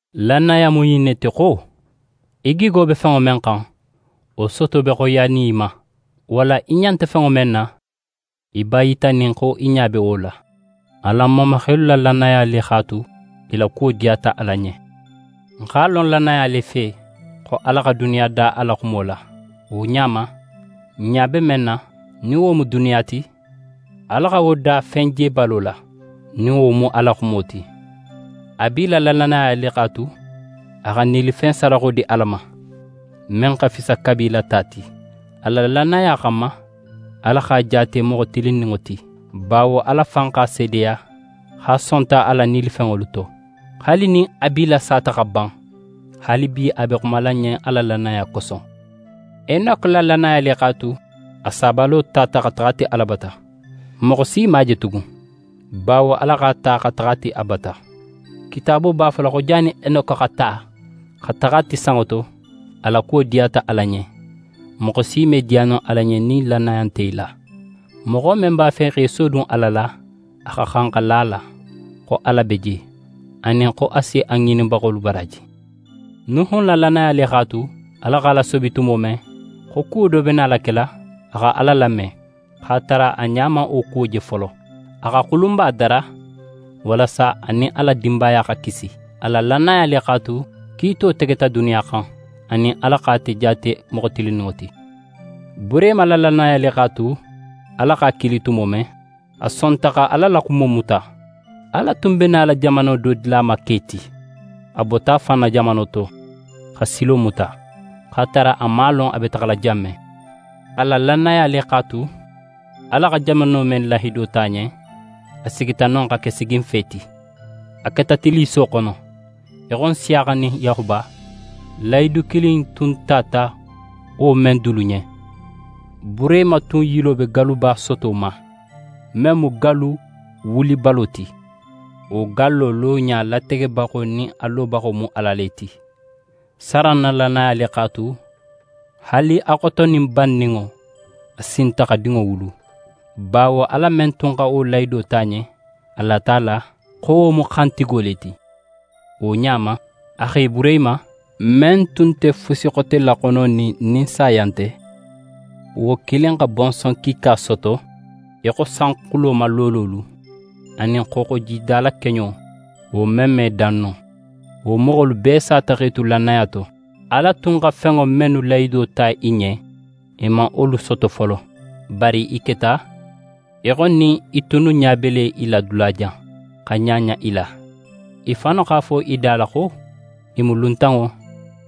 Lannaya mu ɲin ne ti xo: Í gigo be fenŋo men xan, wo soto be xoyiyanin í ma; walla í ɲa nte fenŋo men na, í b'a yitanin xo í ɲa be wo la. Alan mamaxelu la lannaya le x'a tu, i la kuwo diyata Ala ɲen. N x'a lon lannaya le fe xo Ala xa duniya da a la xumo la. Wo ɲa ma, n ɲa be men na, nin wo mu duniya ti, Ala xa wo da fen jebalo la, nin wo mu a la xumo ti. Abila la lannaya le x'a tu, a xa nilifen sadaxo di Ala ma, men xa fisa Kabila ta ti. A la lannaya xanma, Ala x'a jaate moxo tilinninŋo ti, bawo Ala fan x'a seedeya xo a sonta a la nilifenŋolu to. Haali nin Abila sata xa ban, haalibi a be xumala n ɲen a la lannaya koso. Enoke la lannaya le x'a tu a sabalo tata xa taxa a ti Ala bata. Moxo si man a je tugun, bawo Ala x'a ta xa taxa a ti a bata. Kitaabo b'a fola xo jannin Enoke xa ta, xa taxa a ti sanŋo to, a la kuwo diyata Ala ɲen. Moxo si me diya no Ala ɲen nin lannaya nte í la. Moxo men b'a fe xa í sodun Ala la, a xa xan xa la a la, xo Ala be je, anin xo a si a ŋininbaxolu baraaji. Nuhun na lannaya le x'a tu, Ala x'a lasobi tumo men, xo kuwo do be nala kela, a xa Ala lame, x'a tara a ɲa man wo kuwo je folo. A xa xulunba dara walasa a nin a la dinbaya xa kisi. A la lannaya le x'a tu, kiito tegeta duniya xan, anin Ala xa ate jaate moxo tilinninŋo ti. Burehima la lannaya le x'a tu, Ala x'a kili tumo men, a sonta xa Ala la xumo muta. Ala tun be nala jamano do dila a ma ke ti. A bota a fan na jamano to, xa silo muta, x'a tara a man a lon a be taxala jan men. A la lannaya le x'a tu, Ala xa jamano men lahido ta a ɲen, a sigita non xa ke siginfe ti. A keta tilliso xono, í xo Nsiyaxa nin Yaxuba, lahidu kilin in tun tata wo men dulu ɲen. Burehima tun yilo be galluba soto ma, men mu gallu wulibalo ti. Wo gallo loɲa lategebaxo nin a lobaxo mu Ala le ti. Saran na lannaya le x'a tu, haali a xotonin banninŋo, a sinta xa dinŋo wulu, bawo Ala men tun xa wo lahido ta a ɲen, a lata a la xo wo mu xantigo le ti. Wo ɲa ma, a xe Burehima, men tun nte fusi xote laxononin nin saya nte, wo kilin xa bonson kiika soto í xo sanxulo ma loololu, anin xooxojida la keɲo, wo men me dan no. Wo moxolu bee sata x'e tu lannaya to. Ala tun xa fenŋo mennu lahido ta i ɲen, i man wolu soto folo. Bari i keta í xo nin i tunnu ɲa be i la dulajan, xa ɲaɲa i la. I fannu x'a fo i da la xo i mu luntanŋo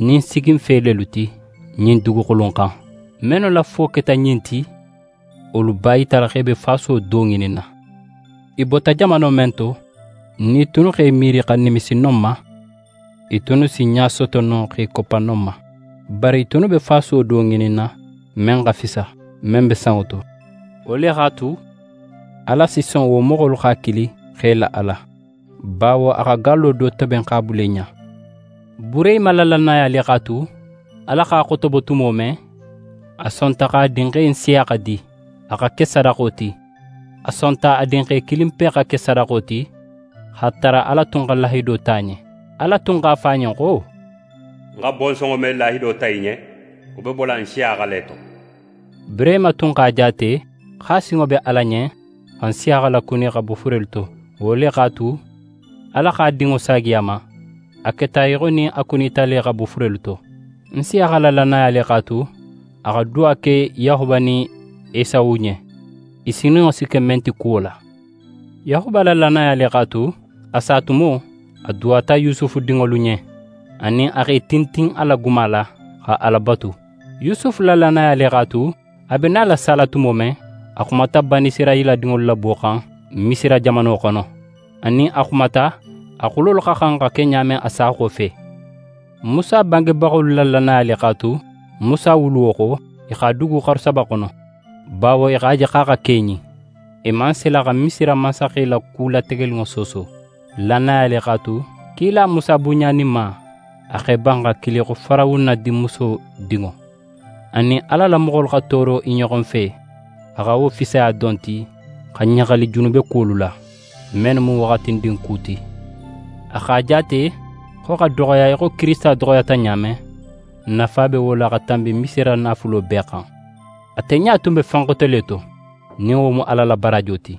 nin siginfe lelu ti ɲin duguxulu in xan. Mennu la fo keta ɲin ti, wolu b'a yitala xo i be fasuwo do ŋininna. I bota jamano men to, nin i tunnu x'e miiri xa nimisi non ma, i tunnu si ɲa soto no x'e koppa non ma. Bari i tunnu be fasuwo do ŋininna men xa fisa, men be sanŋo to. Wo le x'a tu, Ala si son wo moxolu x'a kili xo i la Ala; bawo a xa gallo do toben x'a bula i ɲa. Burehima la lannaya le x'a tu, Ala x'a xotobo tumo men, a sonta x'a dinxe Nsiyaxa di, a xa ke sadaxo ti. A sonta a dinxe kilinpe xa ke sadaxo ti, x'a tara Ala tun xa lahido ta a ɲen. Ala tun x'a fo a ɲen xo: «Ń xa bonsonŋo men lahido ta í ɲen, wo be bola Nsiyaxa le to.» Burehima tun x'a jaate xo a sinŋo be Ala ɲen xa Nsiyaxa lakuni xa bo furelu to. Wo le x'a tu, Ala x'a dinŋo saagi a ma. A keta í xo nin a kunita le xa bo furelu to. Nsiyaxa la lannaya le x'a tu, a xa duwa ke Yaxuba nin Esawu ɲen, i sininŋo si ke men ti kuwo la. Yaxuba la lannaya le x'a tu, a sa tumo, a duwata Yusufu dinŋolu ɲen, anin a x'é tintin a la guma la, xa Ala batu. Yusufu la lannaya le x'a tu, a be nala sala tumo men, a xumata Banisirayila dinŋolu labo xan Misira jamano xono, anin a xumata a xulolu xa xan xa ke ɲa men a sa xofe. Musa bangebaxolu la lannaya le x'a tu, Musa wuluwo xo, i x'a dugu xaru saba xono, bawo i x'a je xo a xa keɲin. I man sila xa Misira mansaxe la ku lategeninŋo sooso. Lannaya le x'a tu, kila Musa bunɲaninma, a x'é ban a xa kili xo Farawuna dinmuso dinŋo. A nin Ala la moxolu xa tooro i ɲoxo fe, a xa wo fisiya don ti xa ɲaxali junubekuwolu la, mennu mu waxatindin ku ti. A x'a jaate xo xa doxoya í xo Kirisita doxoyata ɲa men, nafa be wo la xa tanbi Misira naafulo bee xan. Ate ɲa tun be fen xote le to, nin wo mu Ala la baraajo ti.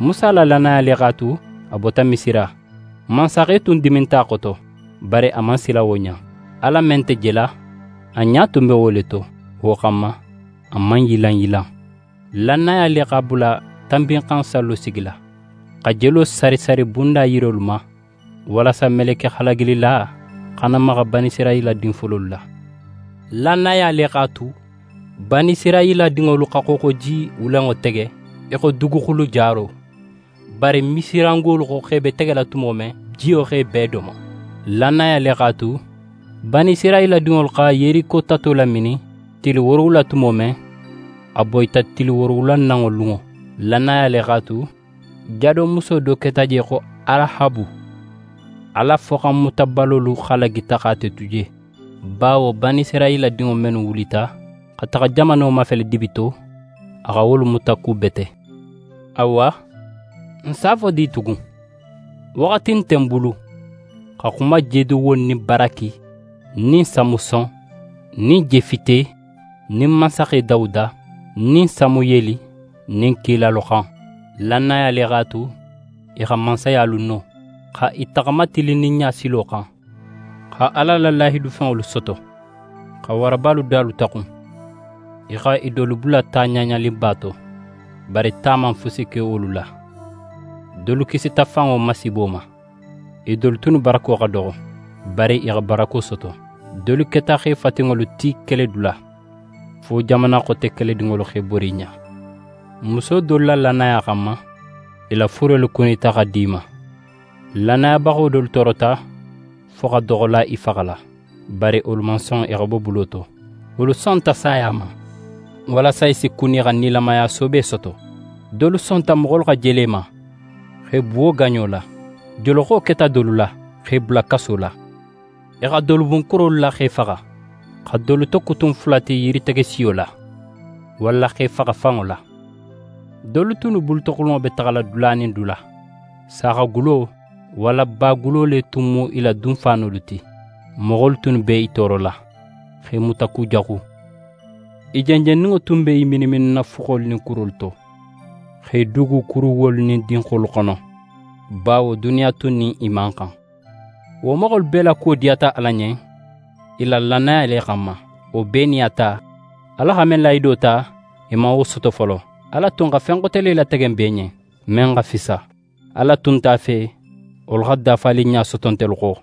Musa la lannaya le x'a tu, a bota Misira. Mansaxe tun diminta a xoto, bari a man sila wo ɲa. Ala men nte jela, a ɲa tun be wo le to. Wo xanma, a man yilanyilan. Lannaya le x'a bula Tanbinxansallo sigila, xa jelo sari sari bunda yirolu ma, walasa meleke halagilila xana maxa Banisirayila din fololu la. Lannaya le x'a tu, Banisirayila dinŋolu xa Xooxoji Wulenŋo tege í xo duguxulu jaro. Bari Misirangolu xo x'e be tegela tumo men, jiyo xa i bee domo. Lannaya le x'a tu, Banisirayila dinŋolu xa Yeriko tato laminin tili woorowula tumo men, a boyita tili woorowulananŋo lunŋo. Lannaya le x'a tu, jadomuso do keta je xo Arahabu, Ala foxanmutabalolu halagita xa ate tu je, bawo Banisirayila dinŋo mennu wulita xa taxa jamano mafele dibi to, a xa wolu mutakubete. Awa, ń si a fo di tugun? Waxati nte ń bulu xa xuma Jedewon nin Baraki nin Samuson nin Jefite nin mansaxe Dawuda nin Samuyeli nin kilalu xan. Lannaya le x'a tu, i xa mansayalu no, xa i taxama tilinninɲa silo xan, xa Ala la lahidufenŋolu soto, xa warabalu dalu taxun. I xa i dolu bula ta ɲaɲaninba to, bari ta man fusi ke wolu la. Dolu kisita fanŋo masiibo ma. I dolu tunnu barako xa doxo, bari i xa barako soto. Dolu keta xe fatinŋolu ti keledula, fo jamana xote keledinŋolu x'e bori i ɲa. Muso dolu la lannaya xanma, i la furelu kunita xa di i ma. Lannayabaxo dolu toorota fo xa doxola i faxala; bari wolu man son i xa bo bulo to. Wolu sonta saya ma, walasa i si kuni xa nilamaya soobe soto. Dolu sonta moxolu xa jele i ma, xa i buwo gaɲo la. Joloxo keta dolu la, xa i bula kaso la. I xa dolu bun kurolu la xa i faxa, xa dolu tokutun fula ti yiritege siyo la, walla xa i faxa fanŋo la. Dolu tunnu bulutoxulunŋo be taxala dula nin dula. Saaxagulo walla bagulo le tun mu i la dunfaanolu ti. Moxolu tunnu b'e toorola, xa i mutakujaxu. I jenjenninŋo tun b'e mininmininna fuxolu nin kurolu to, x'e dugu kuruwuwolu nin dinxolu xono; bawo duniya tun nin i man xan. Wo moxolu bee la kuwo diyata Ala ɲen i la lannaya le xanma. Wo bee nin a ta, Ala xa men lahido ta, i man wo soto folo. Ala tun xa fen xote le latege n bee ɲen, men xa fisa. Ala tun nte a fe wolu xa dafaninɲa soto ntelu xo.